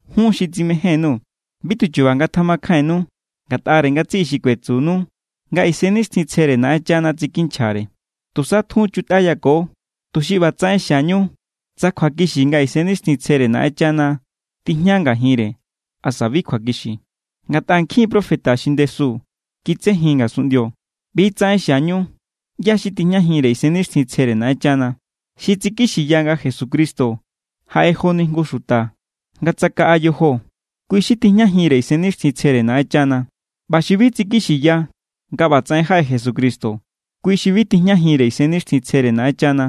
Jun xi tsimején_nuu̱, bi tuchuba ngatjamakjainnu ngatꞌare ngatsiꞌi xi kuetsunu nga Isennixtjintsjere Naꞌenchana tsikinchjare. Tusa tjun chutꞌayako, tuxi ꞌbatsaꞌen xiañu tsa kjuakixi nga Isennixtjintsjere Naꞌenchana tijña ngajinre asa bi kjuakixi. Ngatꞌa nkjin profeta xi ndesu kitsejin ngasunꞌndio. ꞌBi=tsaꞌen xiañu ꞌyá= xi tijñajinre Isennixtjintsjere Naꞌenchana. Xi tsikixiya nga Jesucristo jaꞌe joni jngu xuta nga tsakaꞌa yojo, kui xi tijñajinre Isennixtjintsjere Naꞌenchana. ꞌBa xi bi tsikixiya nga ꞌbatsaꞌen jaꞌe Jesucristo, kui xi bi tijñajinre Isennixtjintsjere Naꞌenchana.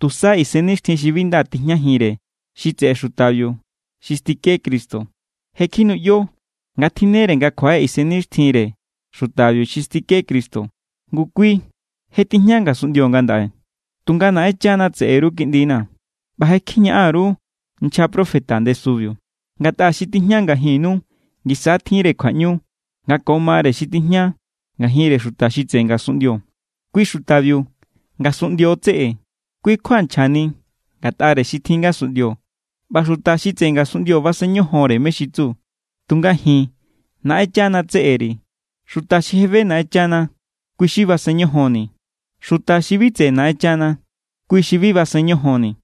Tusa isennixtjin xi bi nda tijñajinre xi tseꞌe xutabiu xi stike Cristo. Je kjinuꞌyo nga tjinnere nga kjuaꞌe isennixtjinre xutabiu xi stike Cristo. Ngu, kui je tijña ngasunꞌndio ngandaꞌe. Tunga Naꞌenchana tseꞌe_ru, kiꞌndina̱, ꞌba je kjiñaꞌan_ru nchja profeta ndesubiu, ngatꞌa xi tijña ngajinnu ngisa= tjinre kjuaꞌñu nga ko mare xi tijña ngajinre xuta xi tseꞌe ngasunꞌndio. Kui xutabiu ngasunꞌndio= tseꞌe. Kui= kjua nchjani ngatꞌare xi tjin ngasunꞌndio ꞌba xuta xi tseꞌe ngasunꞌndio basen ñojonre mé= xi tsu. Tunga ji̱n, Naꞌenchana tseꞌe_ri̱. Xuta xi je be Naꞌenchana, kui xi basen ñojonni̱. Xuta xi bi tseꞌe Naꞌenchana, kui xi bi basen ñojonni̱.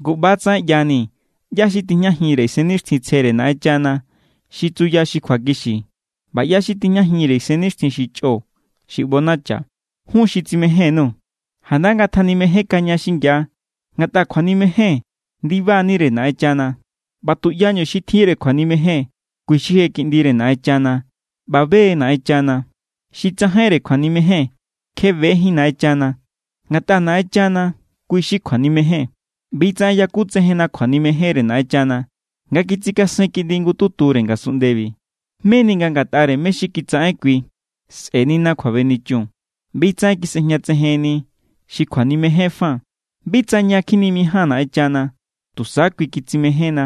Ngu, ꞌba=tsaꞌen ꞌyanii̱ ꞌyá= xi tijñajinre Isennixtjintsjere Naꞌenchana xi tsuya xi kjuakixi ꞌba ꞌyá= xi tijñajinre isennixtjin xi chꞌo xi ꞌbonacha. Jun xi tsimején_nuu̱, janda ngatjanimejénkaña xingia, ngatꞌa kjuanimejen ndiba=nire Naꞌenchana ꞌba tuꞌyañu xi tjinre kjuanimejen, kui xi je kiꞌndire Naꞌenchana ꞌba be= Naꞌenchana. Xi tsajainre kjuanimejen, kje bejín Naꞌenchana, ngatꞌa Naꞌenchana kui= xi kjuanimejen. ꞌBi=tsaꞌen yakutsejenna kjuanimejenre Naꞌenchana, nga kitsikasen Kiꞌndi jngututure ngasunꞌndebi, meni nga ngatꞌare mé= xi kitsaꞌen kui sꞌe̱nina kjuabenichun. ꞌBi=tsaꞌen kisꞌejñatsejenni xi kjuanimejen fa, bi tsa ña kjinimijáan Naꞌenchana, tusa kui kitsimejénna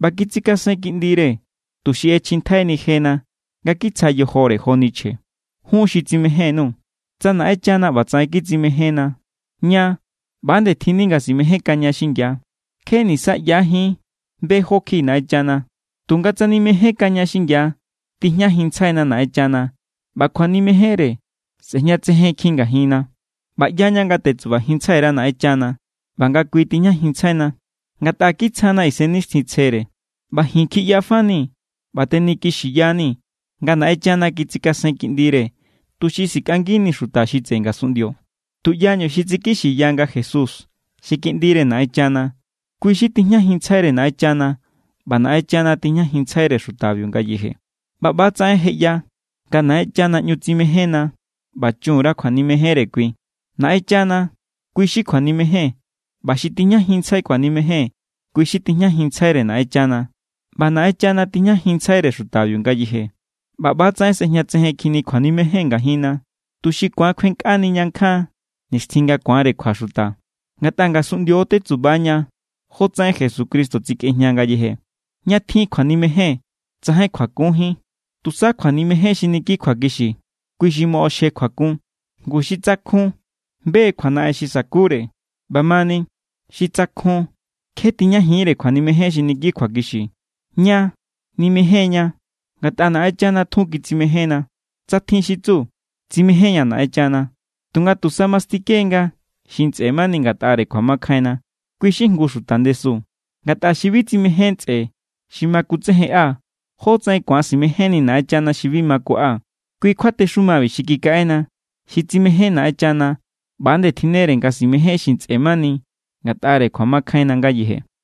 ꞌba kitsikasen Kiꞌndire tuxi ꞌechjintjaini jena nga kitsja yojore joni chje. Jun xi tsimején_nuu̱, tsa Naꞌenchana ꞌbatsaꞌen kitsimejénna, ña ꞌba=nde tjinni nga simejénkaña xingia. Kje nisaꞌyajín be jó kjiꞌi Naꞌenchana, tunga tsa nimejénkaña xingia, tijñajinntsjaina Naꞌenchana ꞌba kjuanimejenre sꞌejñatsejenkjin ngajinna. ꞌBa ꞌyaña nga tetsubajinntsjai_ra Naꞌenchana ꞌba nga kui tijñajinntsjaina, ngatꞌa kitsjana Isennixtjintsjere. ꞌBa ji̱n kjiꞌya fanii̱ ꞌba tenikixiyanii̱ nga Naꞌenchana kitsikasen Kiꞌndire tuxi sikꞌangini xuta xi tseꞌe ngasunꞌndio. Tuꞌyañu xi tsikixiya nga Jesús xi Kiꞌndire Naꞌenchana, kui xi tijñajinntsjaire Naꞌenchana ꞌba Naꞌenchana tijñajinntsjaire xutabiu ngayeje. ꞌBa ꞌba=tsaꞌen je ꞌya nga Naꞌenchana ꞌñu tsimejénna ꞌba chun_ra kjuanimejenre kui. Naꞌenchana kui= xi kjuanimejen, ꞌba xi tijñajinntsjai kjuanimejen, kui= xi tijñajinntsjaire Naꞌenchana ꞌba Naꞌenchana tijñajinntsjaire xutabiu ngayeje. ꞌBa ꞌba=tsaꞌen sꞌejñatsejenkjinni kjuanimejen ngajinna, tuxi ku̱an kjuenkꞌaniña nkjan nixtjin nga ku̱anre kjua xuta. Ngatꞌa ngasunꞌndio= tetsuba ña jotsaꞌen Jesucristo tsikꞌejña ngayeje. Ña tjin kjuanimejen tsajain kjuakunjín. Tusa kjuanimejen xi niki kjuakixi, kui xi moꞌoxje kjuakun. Ngu xi tsakjun be= kjuanaꞌen xi sa̱kure. ꞌBamani xi tsakjun, kje tijñajiínre kjuanimejen xi niki kjuakixi. Ña nimején=ña ngatꞌa Naꞌenchana tjun kitsimejénna. Tsa tjin xi tsu: “Tsimején=ña̱ Naꞌenchana”, tunga tusa mastike=nga xi ntsꞌe mani ngatꞌare kjuamakjainna, kui xi jngu xuta ndesu. Ngatꞌa xi bi tsimején ntsꞌe xi ma kutsejenꞌa, ¿jótsaꞌen ku̱an simejénni Naꞌenchana xi bi ma kuꞌa? Kui kjuatexumabi xi kikaꞌena: xi tsimején Naꞌenchana ꞌba=nde tjinnere nga simején xi ntsꞌe mani ngatꞌare kjuamakjainna ngayeje.